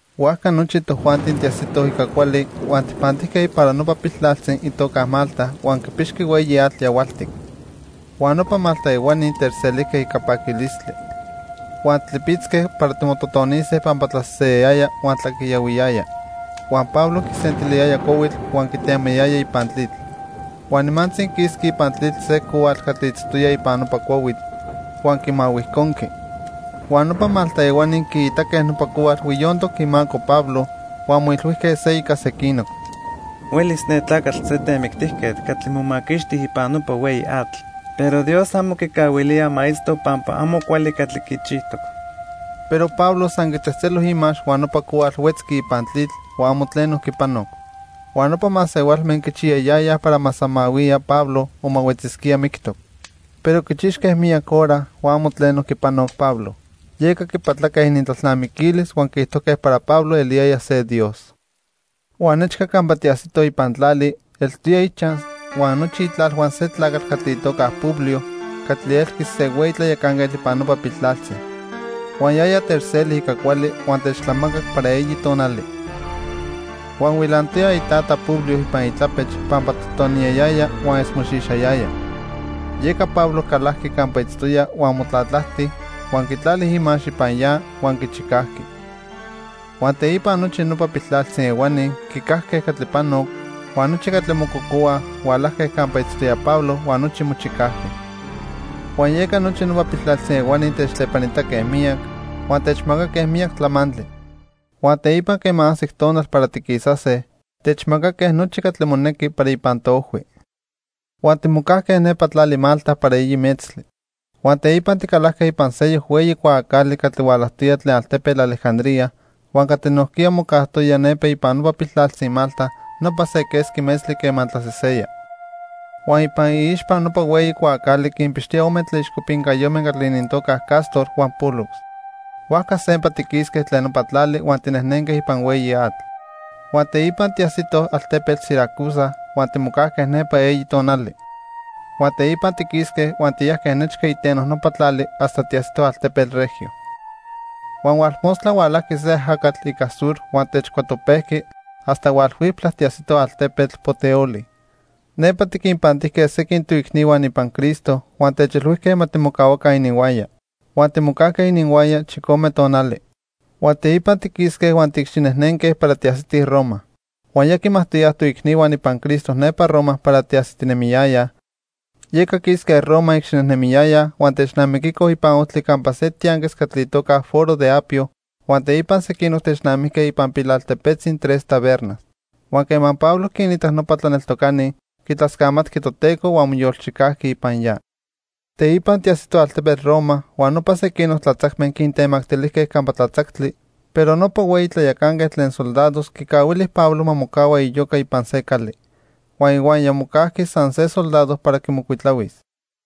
Huajca nochi tojuanti tiajsitoj ica cuali, huan tijpantijque para nopa piltlaltzi itoca Malta huan quipixqui hueyi atl yahualtic. Huan nopa Malta ehuani techselijque ica paquilistli. Huan tlipitzque para timototonise pampa tlaseseya huan tlaquiyahuiyaya. Huan Pablo quisentiliyaya cuahuitl huan quitemayaya ipan tlitl. Huan nimantzi quisqui ipan tlitl se cohuatl catli itztoya ipan nopa cuahuitl, huan quimahuijconqui. Huan nopa Malta ehuani quiitaque nopa cohuatl huiyontoc imaco Pablo huan moilhuijque se ica sequinoc: "Huelis ne tlacatl se temictijquetl catli momaquixti ipan nopa hueyi atl, pero Dios amo quicahuilía ma itzto pampa amo cuali catli quichijtoc." Pero Pablo san quitzejtzelo imax huan nopa cohuatl huetzqui ipan tlitl, huan amo tleno quipanoc. Huan nopa masehualme quichiyayayaj para ma samahuiya Pablo o ma huetzisquía mictoc. Pero quichixque miyac hora, huan amo tleno quipanoc Pablo. Yeca quipatlaque inintlalnamiquilis huan quiijtojque para Pablo eliyaya se dios. Huan nechca campa tiajsitoj ipan tlali, eltoya ichaj huan nochi itlalhua se tlacatl itoca Publio catli elqui se hueyi tlayacanquetl ipan nopa piltlaltzi. Huan yaya techseli ica cuali huan techtlamacac para eyi tonali. Huan huilantoya itata Publio ipan itlapech pampa totoniyayaya huan esmoxixayaya. Yeca Pablo calajqui campa itztoya huan motlatlajti, huan quitlali imax ipan ya huan quichicajqui. Huan teipa nochi nopa piltlaltzi ehuani quicajque catli panoc, huan nochi catli mococohuaj hualajque campa itztoya Pablo huan nochi mochicajque. Huan yeca nopa piltlaltzi ehuani techtlepanitaque miyac huan techmacaque miyac tlamantli. Huan teipa quema ajsic tonal para tiquisase, techmacaque nochi catli monequi para ipan toojhui. Huan timocajque nepa tlali Malta para eyi metztli. Huan teipa ticalajque ipan seyoc hueyi cuaacali catli hualajtoya tlen altepetl Alejandría huan catli nojquiya mocajtoya nepa ipan nopa piltlaltzi Malta nopa se quesqui metztli quema tlaseseya. Huan ipan iixpa nopa hueyi cuaacali quinpixtoya ome tlaixcopincayome catli inintocax Cástor huan Pólux. Huajca sempa tiquisque tlen nopa tlali huan tinejnenque ipan hueyi atl. Huan teipa tiajsitoj altepetl Siracusa huan timocajque nepa eyi tonali. Huan teipa tiquisque huan tiyajque nechca iteno nopa tlali hasta tiajsitoj altepetl Regio. Huan hualmostla hualajqui se ajacatl ica sur huan techcuatopejqui hasta hualhuiptla tiajsitoj altepetl Puteoli. Nepa tiquinpantijque sequin toicnihua ipan Cristo huan techilhuijque ma timocahuaca ininhuaya. Huan timocajque ininhuaya chicome tonali. Huan teipa tiquisque huan tiicxinejnenque para tiajsitij Roma. Huan ya quimajtoyaj toicnihua ipan Cristo nepa Roma para tiajsitinemiyayaj. Yeca quisque Roma icxinejnemiyayaj huan technamiquicoj ipan ojtli campa se tianquis catli itoca Foro de Apio, huan teipa sequinoc technamijque ipan pilaltepetzi Tres Tabernas. Huan quema Pablo quinitac nopa tlaneltocani, quitlascamatqui Toteco huan moyolchicajqui ipan ya. Teipa tiajsitoj altepetl Roma huan nopa sequinoc tlatzacme quintemactilijque campa tlatzactli, pero nopa hueyi tlayacanquetl tlen soldados quicahuili Pablo ma mocahua iyoca ipan se cali. Huan ihuaya mocajqui san se soldado para quimocuitlahuis.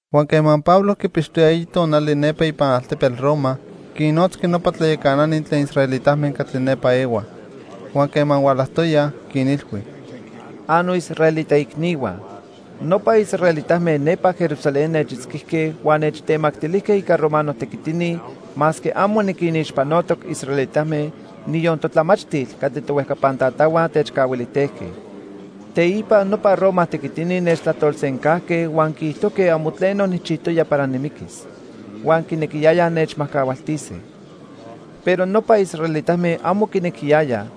Huan quema Pablo quipixtoya eyi tonali nepa ipan altepetl Roma, quinnotzqui nopa tlayacanani tlen israelitame catli nepa ehuaj. Huan quema hualajtoyaj, quinilhui: —Annoisraelita icnihua, nopa israelitame nepa Jerusalén nechitzquijque huan nechtemactilijque ica romano tequitini masque amo niquinixpanotoc israelitame, niyon totlamachtil catli tohuejcapan tatahua techcahuilijtejque. Teipa nopa Roma tequitini nechtlajtolsencajque huan quiijtojque amo tleno nijchijtoya para nimiquis. Huan quinequiyayaj nechmajcahualtise. Pero nopa israelitame amo quinequiyayaj,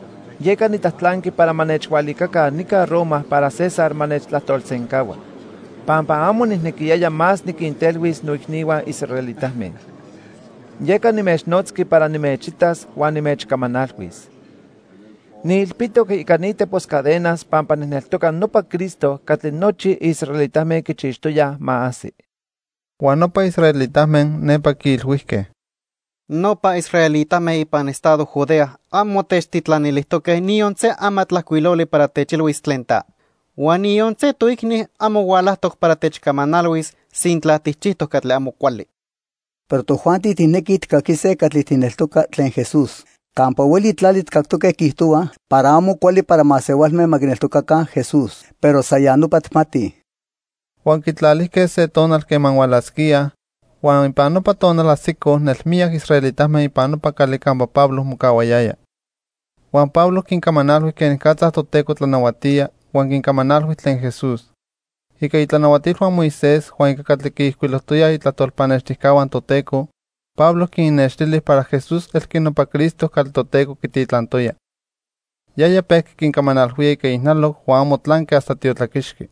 yeca nitlajtlanqui para ma nechhualicaca nica Roma para César ma nechtlajtolsencahua, pampa amo nijnequiyaya más niquintelhuis noicnihua israelitame. Yeca nimechnotzqui para nimechitas huan nimechcamanalhuis. Niilpitoc ica ni tepos cadenas pampa nijneltoca nopa Cristo catli nochi israelitame quichixtoyaj ma ajsi. Huan nopa israelitame nepa quiilhuijque: —Nopa israelitame ipan estado Judea amo techtitlanilijtoque niyon se amatlajcuiloli para techilhuis tlen ta. Huan niyon se toicni amo hualajtoc para techcamanalhuis sintla tijchijtoc catli amo cuali. Pero tojuanti tijnequij tijcaquise catli tijneltoca tlen Jesús. Campa hueli tlali tijcactoque quiijtohuaj para amo cuali para masehualme ma quineltocaca Jesús. Pero san ya nopa tijmatij. Huan quitlalijque se tonal quema hualasquíaj, huan ipan nopa tonal ajsicoj nelmiyac israelitame ipan nopa cali campa Pablo mocahuayaya. Huan Pablo quincamanalhui quenicatza Toteco tlanahuatía huan quincamanalhui tlen Jesús. Ica itlanahuatilhua Moisés huan ica catli quiijcuilojtoyaj itlajtol pannextijcahua Toteco, Pablo quinnextili para Jesús elqui nopa Cristo catli Toteco quititlantoya. Yaya pejqui quincamanalhuía ica ijnaloc huan amo tlanqui hasta tiotlaquixqui.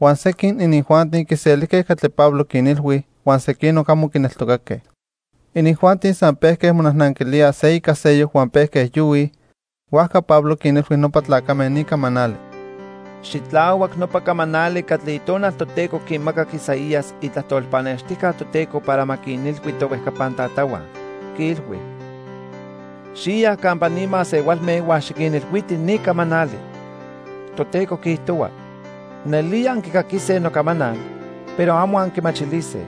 Huan sequin inijuanti quiselijque catli Pablo quinilhui, huan sequinoc amo quineltocaque. Inijuanti san pejque monajnanquilíaj se ica seyoc huan pejque yohuij. Huajca Pablo quinilhui nopa tlacame ni camanali: —Xitlahuac nopa camanali catli Itonal Toteco quimacac Isaías, itlajtol pannextijca Toteco para ma quinilhui tohuejcapan tatahua. Quiilhui: 'Xiya campa ni masehualme huan xiquinilhuiti ni camanali. Toteco quiijtohua: Nelía anquicaquise nocamanal, pero amo anquimachilise.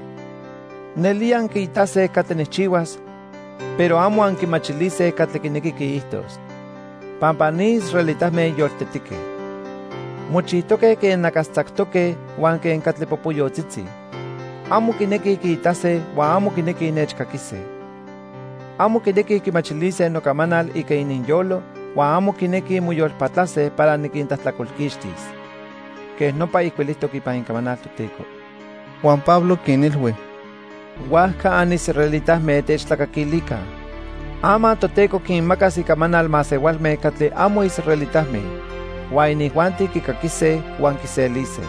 Nelía anquiitase catli nijchihuas, Pero amo anquimachilise catli quinequi quiijtos. Pampa ni israelitame yoltetique. Mochijtoque quen nacastzactoque huan quen catli popoyotzitzi. Amo quinequij quiitase huan amo quinequij nechcaquise. Amo quinequij quimachilise nocamanal ica ininyolo, Huan amo quinequij moyolpatlase para niquintlajtlacolquixtis. Quej nopa ijcuilijtoc ipan Icamanal Toteco.' Huan Pablo quinilhui: —Huajca anisraelitame, techtlacaquilica. Ama Toteco quinmacas icamanal masehualme catli amo israelitame. Huan inijuanti quicaquise huan quiselise.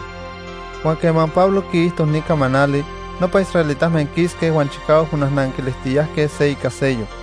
Huan quema Pablo quiijto ni camanali, nopa israelitame quisque huan chicahuac monajnanquilijtiyajque se ica seyoc.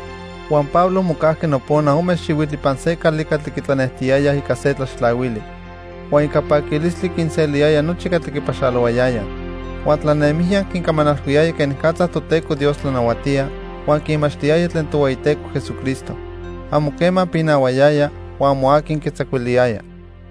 Huan Pablo mocajqui nopona ome xihuitl ipan se cali catli quitlanejtiyayaj ica se tlaxtlahuili. Huan ica paquilistli quinseliyaya nochi catli quipaxalohuayayaj. Huan tlanemijya quincamanalhuiyaya quenicatza Toteco Dios tlanahuatía, huan quinmachtiyaya tlen Tohueyiteco Jesucristo. Amo quema pinahuayaya, huan amo aqui quitzacuiliyaya.